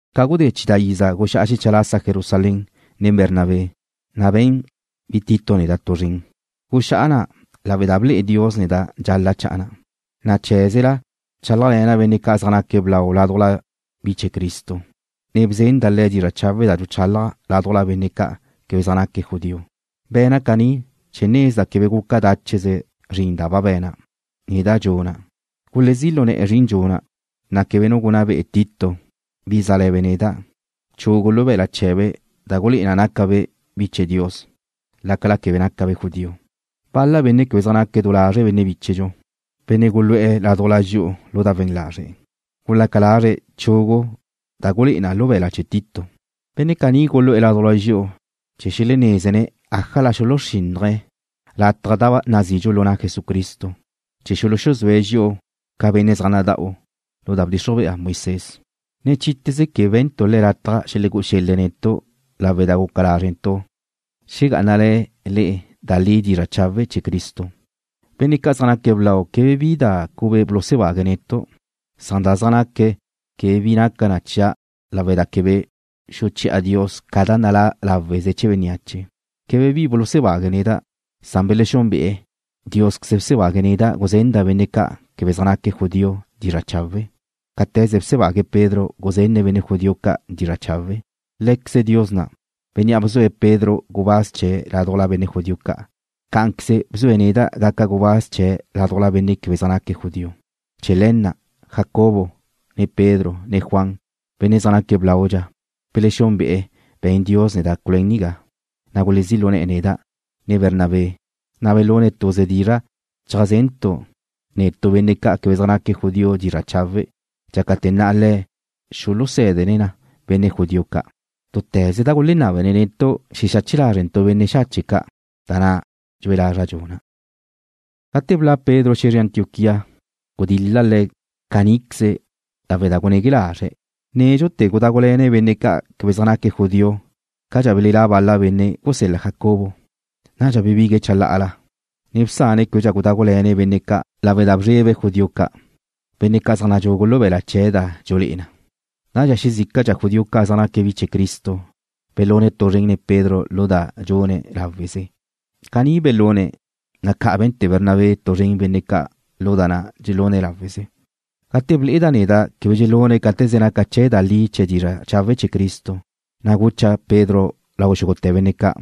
Ca gudé chidá' iza guxá'a xecha lasa Jerusalén nen Bernabé, na' be̱n bi Tito neda' tu zren. Guxá'a na' lawe' da ble'e Dios neda' dxal-la' cha'a na'. Na' cheé̱zela bchálajle̱na' benne' ca' zaj naque̱' blau ládujla bi chee̱ Cristo, ne bzenda' le̱' dizra' chawe' da dxuchálaja' ládujla benne' ca' quebe zaj naque̱' judío. Be̱na' caní chee̱ nezda' quebe guca dácheze zrin da ba be̱na', ne da dxuna'. Gulezí' lu ne̱'e̱ zrin nuna', na' quebe nu gunná be'e Tito, bi zále̱be' neda', chugu lu be̱la' chee̱be' da gulé'e na nácabe' bi chee̱ Dios, lácala quebe nácabe' judío. Bal-la benne' quebe zaj naque̱' du lazre' benne' bíchedxu, benne' gulu'e̱ ládujla dxi'u lu da we̱n lazre', gulaca lazre̱' chugu da gulé'e na lu be̱la' chee̱ Tito. Benne' caní gulu'e̱ ládujla dxi'u chee̱ xelenézene̱' ájala xelegúe̱' lataj da nazidxu lu na' Jesucristo, chee̱ xuluxuzúe̱' dxi'u ca benne' zaj nada'u lu da bdxixruj bea Moisés. Ne chite̱ze quebe be̱ntu' le̱' lataj xelegú'u xel-le̱' netu' lawe' da guca lázrentu' xegá'anale̱ le'e da li dizra' chawe' chee̱ Cristo. Benne' ca' zaj naque̱' blau quebe bi da cube bulusebague̱' netu'. Da zaj naque̱' quebe bi naca na chia' lawe' da quebe xuchí'a Dios ca da nalá' láweze chee̱ bénneache. Quebe bi bulusebague̱' neda', lawe' da belexúnbe'e̱ Diósqueze bsebague̱' neda' guzenda' benne' ca' quebe zaj naque̱' judío dizra' chawe', cáte̱ze bsebague̱' Pedro guzenne̱' benne' judío ca' dizra' chawe'. Lé̱queze Dios na', Bénnea' bzue̱' Pedro gubáz chee̱' ládujla benne' judío ca', cá'anqueze bzue̱' neda' gaca' gubáz chee̱' ládujla benne' quebe zaj naque̱' judío. Chee̱ le̱ na', Jacobo, ne Pedro, ne Juan, benne' zaj naque̱' blaudxa, belexúnbe'e̱ be̱n Dios neda' culuén nigá, na' gulezí' lu ne̱'e̱ neda', ne Bernabé, na' belune̱' tuze dizra' cheajzentu' netu' benne' ca' quebe zaj naque̱' judío dizra' chawe', dxácate̱ na' le̱' xuluzenne̱' na benne' judío ca'. Túte̱ze da gulenábene̱' netu' xexache lázrentu' benne' xache' ca', da na' dxue lazra' dxuna'. Gate bla' Pedro xe̱zre Antioquía gudil-la' le̱' caníqueze lawe' da gunegue lazre̱'. Nédxute̱ gudágule̱ne̱' benne' ca' quebe zaj naque̱' judío cadxa belelá' bal-la benne' gusel-la Jacobo. Nadxa bebigue̱'e̱ chalá'ala, ne bsane̱' québedxa gudágule̱ne̱' benne' ca' lawe' da bzrebe̱' judió ca', benne' ca' zaj nadxugu lu be̱la' chee̱' da dxulé'e na. Nadxa xezícadxa judío ca' zaj naque̱' bi chee̱ Cristo belune̱' tu zren Pedro lu da dxune̱' láweze. Caní belune̱', na' ca' be̱nte̱ Bernabé tu zren benne' ca' lu da na' dxelune̱' láweze. Gate ble'eda' neda' quebe dxelune̱' cáte̱ze naca chee̱ da li chee̱ dizra' chawe' chee̱ Cristo, na' gucha' Pedro lau xúgute̱ benne' ca':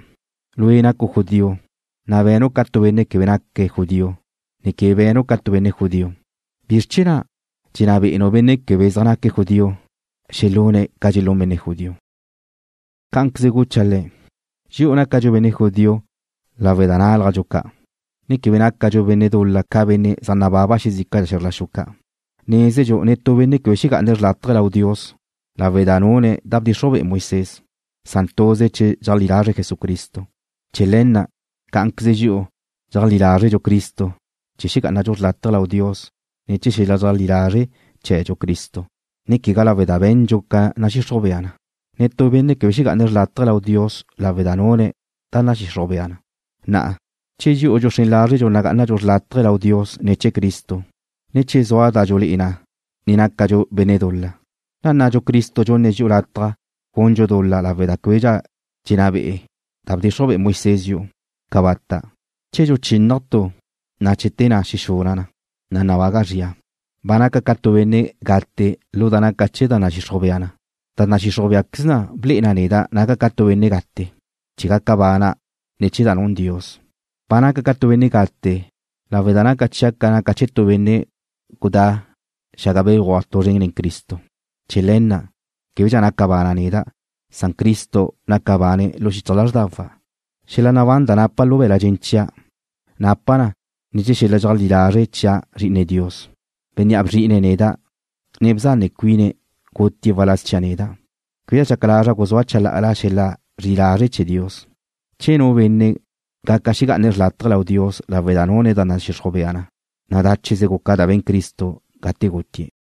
Lue' nacu' judío, na' benu' ca tu benne' quebe naque̱' judío, ne quebe be̱nu' ca tu benne' judío. ¿Bizr chee̱ na' dxenná be'enu' benne' quebe zaj naque̱' judío xelune̱' ca dxelún benne' judío? Cá'anqueze gucha'-ne̱': Dxi'u nácadxu benne' judío lawe' da nálajdxu ca', ne quebe nácadxu benne' dul-la ca benne' zaj nababa xezícadxa xe̱zr la xu ca'. Nézedxu netú benne' quebe xegá'ane̱' xrlátaje lau Dios lawe' da nune̱' da bdxixruj be'e Moisés, san tuze che dxeajlí lazre̱' Jesucristo. Chee̱ le̱ na' cá'anqueze dxi'u dxeajlí lázredxu Cristo chee̱ xegá'anadxu xrlátaje lau Dios ne̱ chee̱ xel-la dxeajlí lazre' chee̱dxu Cristo, ne quegá lawe' da be̱ndxu ca nadxixruj bea na. Netú benne' quebe xegá'ane̱' xrlátaje lau Dios lawe' da nune̱' da nadxixruj bea na. Na'a, che dxi'u dxuxrén lázredxu nagá'anadxu xrlátaje lau Dios ne̱ chee̱ Cristo, ne che zua da dxulé'e na ne nácadxu benne' dul-la, ¿nnadxu Cristo dxunne̱' dxi'u lataj gundxu dul-la lawe' da québedxa dxenná be'e da bdxixruj be'e Moisés dxi'u? ¡Cabata'! Che dxuchínnaja' tu, na' che te na' xexuna' na, na' nabaga' zria. Ba naca' ca tu benne' gate lu da naca chee̱ da nadxixruj bea na. Da nadxixruj béaqueze ble'e na neda' naca' ca tu benne' gate, chee̱ gaca bana' ne̱ chee̱ da nun Dios. Ba naca' ca tu benne' gate lawe' da naca chia' ca naca chee̱ tu benne' gudá' xaga béguaj tu zren nen Cristo. Chee̱ le̱ na', québedxa naca bana' neda'. Cristo naca bane̱' lu xichaj lázrdawa'. Xel-la nabán da napa' lu be̱la' dxen chia', napa' na ne̱ chee̱ xel-la dxeajlí lazre' chia' Zri'ine Dios, Bénnea' bzri'ine̱' neda', ne bzane cuine̱', gutie̱' waláz chia' neda'. Quebe dxaca lazra' guzúa' chalá'ala xel-la zri'i lazre' chee̱ Dios. Che nu benne' gaca xegá'ane̱' xrlátaje lau Dios lawe' da nune̱' da nadxixruj bea na, na' dácheze guca da be̱n Cristo gate gutie̱'.